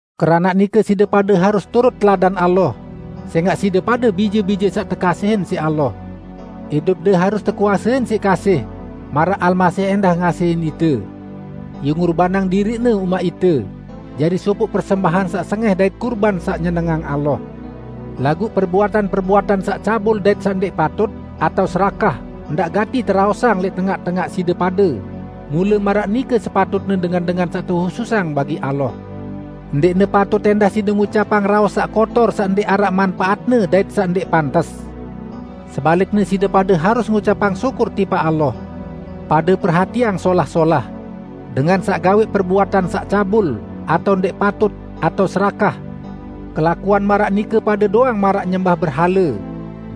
Keranaq nike side pade harus turut teladan Allah, sẽngaq side pade bije-bije saq tekasihin siq Allah. Idupde harus tekuasein siq kasih, maraq Almasih ẽndah ngasihin ite. Ie ngurbanang diriq-Ne umaq ite, jari sopoq persembahan saq sengẽh dait kurban saq nyenengang Allah. Laguq perbuatan-perbuatan saq cabul dait saq ndẽq patut, atao serakah, ndaq gati teraosang lẽq tengaq-tengaq side pade -- mule maraq nike sepatutne dengan-dengan saq tehususang bagi Allah. Ndẽqne patut ẽndah side ngucapang raos saq kotor saq ndẽq araq manpaatne dait saq ndẽq pantes. Sebalikne side pade harus ngucapang syukur tipaq Allah. Pade perhatiang solah-solah: Dengan saq gawẽq perbuatan saq cabul, atao ndẽq patut, atao serakah (kelakuan maraq nike pade doang maraq nyembah berhale),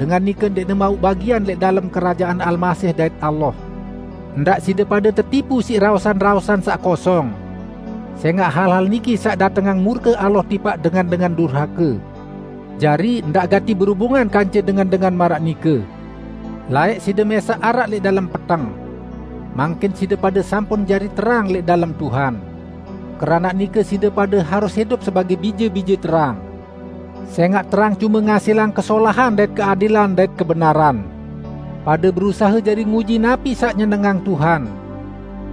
dengan nike ndẽqne mauq bagian lẽq dalem Kerajaan Almasih dait Allah. Ndaq side pade tetipu siq raosan-raosan saq kosong. Sẽngaq hal-hal niki saq datengang murke Allah tipaq dengan-dengan durhake. Jari, ndaq gati berubungan kance dengan-dengan maraq nike. Laẽq side mẽsaq araq lẽq dalem peteng. Mangkin side pade sampun jari terang lẽq dalem Tuhan. Keranaq nike side pade harus idup sebagẽ bije-bije terang. Sẽngaq terang cume ngasilang kesolahan dait keadilan dait kebenaran. Pade berusahe jari nguji napi saq nyenengang Tuhan.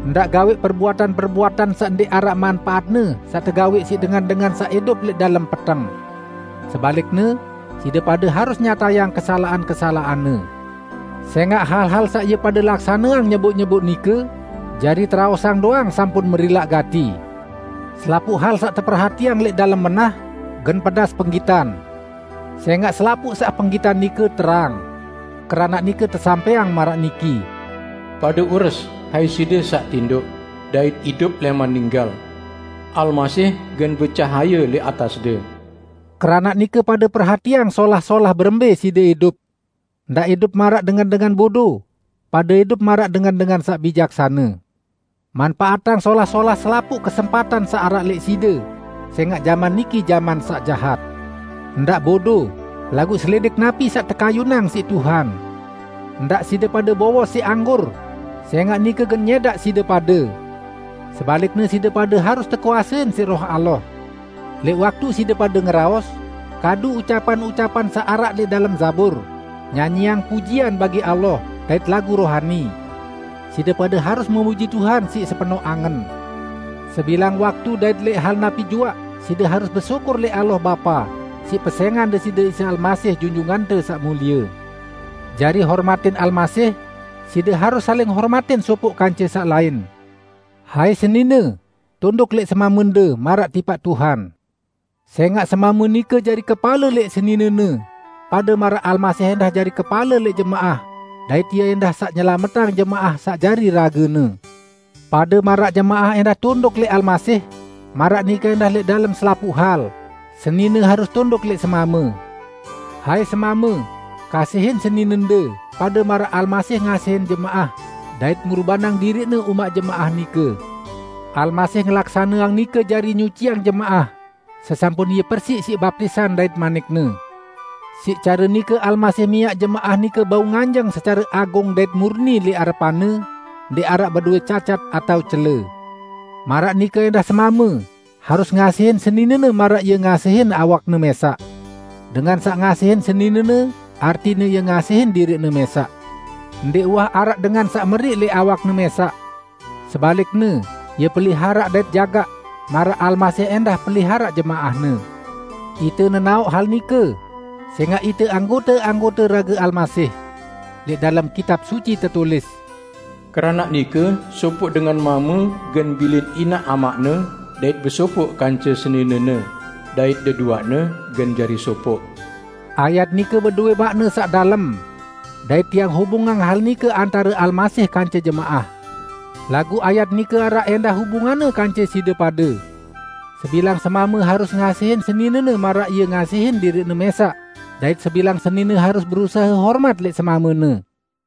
Ndaq gawẽq perbuatan-perbuatan saq ndẽq araq manpaatne saq tegawẽq siq dengan-dengan saq idup lẽq dalem peteng. Sebalikne, side pade harus nyatayang kesalaqan-kesalaqanne. ( Sẽngaq hal-hal saq ie pade laksaneang nyeboq-nyeboq nike, jari teraosang doang sampun merilaq gati.) Selapuq hal saq teperhatiang lẽq dalem menah, gen pedas penggitan. Sẽngaq selapuq saq penggitan nike terang. Keranaq nike tesampẽang maraq niki, "Pade ures, hai side saq tindoq, dait idup lẽman ninggal! Almasih gen becahaye lẽq atasde." Keranaq nike, pade perhatiang solah-solah berembẽ side idup. Ndaq idup maraq dengan-dengan bodo; pade idup maraq dengan-dengan saq bijaksane. Manpaatang solah-solah selapuq kesempatan saq araq lẽq side, sẽngaq jaman niki jaman saq jahat. Ndaq bodo, laguq selidik napi saq tekayunang siq Tuhan. Ndaq side pade bowos siq anggur, sẽngaq nike gen nyẽdaq side pade. Sebalikne side pade harus tekuasein siq Roh Allah. Lẽq waktu side pade ngeraos, kadu ucapan-ucapan saq araq lẽq dalem Zabur, nyanyiang pujian bagi Allah dait lagu rohani. Side pade harus memuji Tuhan siq sepenoq angen. Sebilang waktu dait lẽq hal napi juaq side harus besyukur lẽq Allah Bapa, siq pesẽngan Deside Isa Almasih, Junjungante Saq Mulie. Jari hormatin Almasih, side harus saling hormatin sopoq kance saq lain. Hai senine, tunduk lẽq semamende, maraq tipaq Tuhan. Sẽngaq semame nike jari kepale lẽq seninene, pade maraq Almasih ẽndah jari kepale lẽq jemaah dait Ie ẽndah saq nyelametang jemaah saq jari rage-Ne. Pade maraq jemaah ẽndah tunduk lẽq Almasih, maraq nike ẽndah lẽq dalem selapuq hal, senine harus tunduk lẽq semame. Hai semame, kasihin seninende, pade maraq Almasih ngasihin jemaah dait ngurbanang diriq-Ne umaq jemaah nike. Almasih ngelaksaneang nike jari nyuciang jemaah, sesampun Ie persiq siq baptisan dait manik-Ne. Siq care nike Almasih miaq jemaah nike bau nganjeng secare agung dait murni lẽq arepan-Ne, ndẽq araq bedowẽ cacat atao cele. Maraq nike ẽndah semame harus ngasihin seninene maraq ie ngasihin awakne mẽsaq. Dengan saq ngasihin seninene artine ie ngasihin diriqne mẽsaq. ( Ndẽq uwah araq dengan saq meriq lẽq awakne mẽsaq. Sebalikne, ie peliharaq dait jagaq, maraq Almasih ẽndah peliharaq jemaah-Ne. Ite nenaoq hal nike, sẽngaq ite anggote-anggote rage Almasih.) Lẽq dalem Kitab Suci tetulis, "Keranaq nike sopoq dengan mame gen bilin inaq amaqne dait besopoq kance seninene, dait deduaqne gen jari sopoq." Ayat nike bedowẽ maqne saq dalem. Dait tiang hubungang hal nike antare Almasih kance jemaah. Laguq ayat nike araq ẽndah hubunganne kance side pade. Sebilang semame harus ngasihin seninene maraq ie ngasihin diriqne mẽsaq dait sebilang senine harus berusahe hormat lẽq semamene.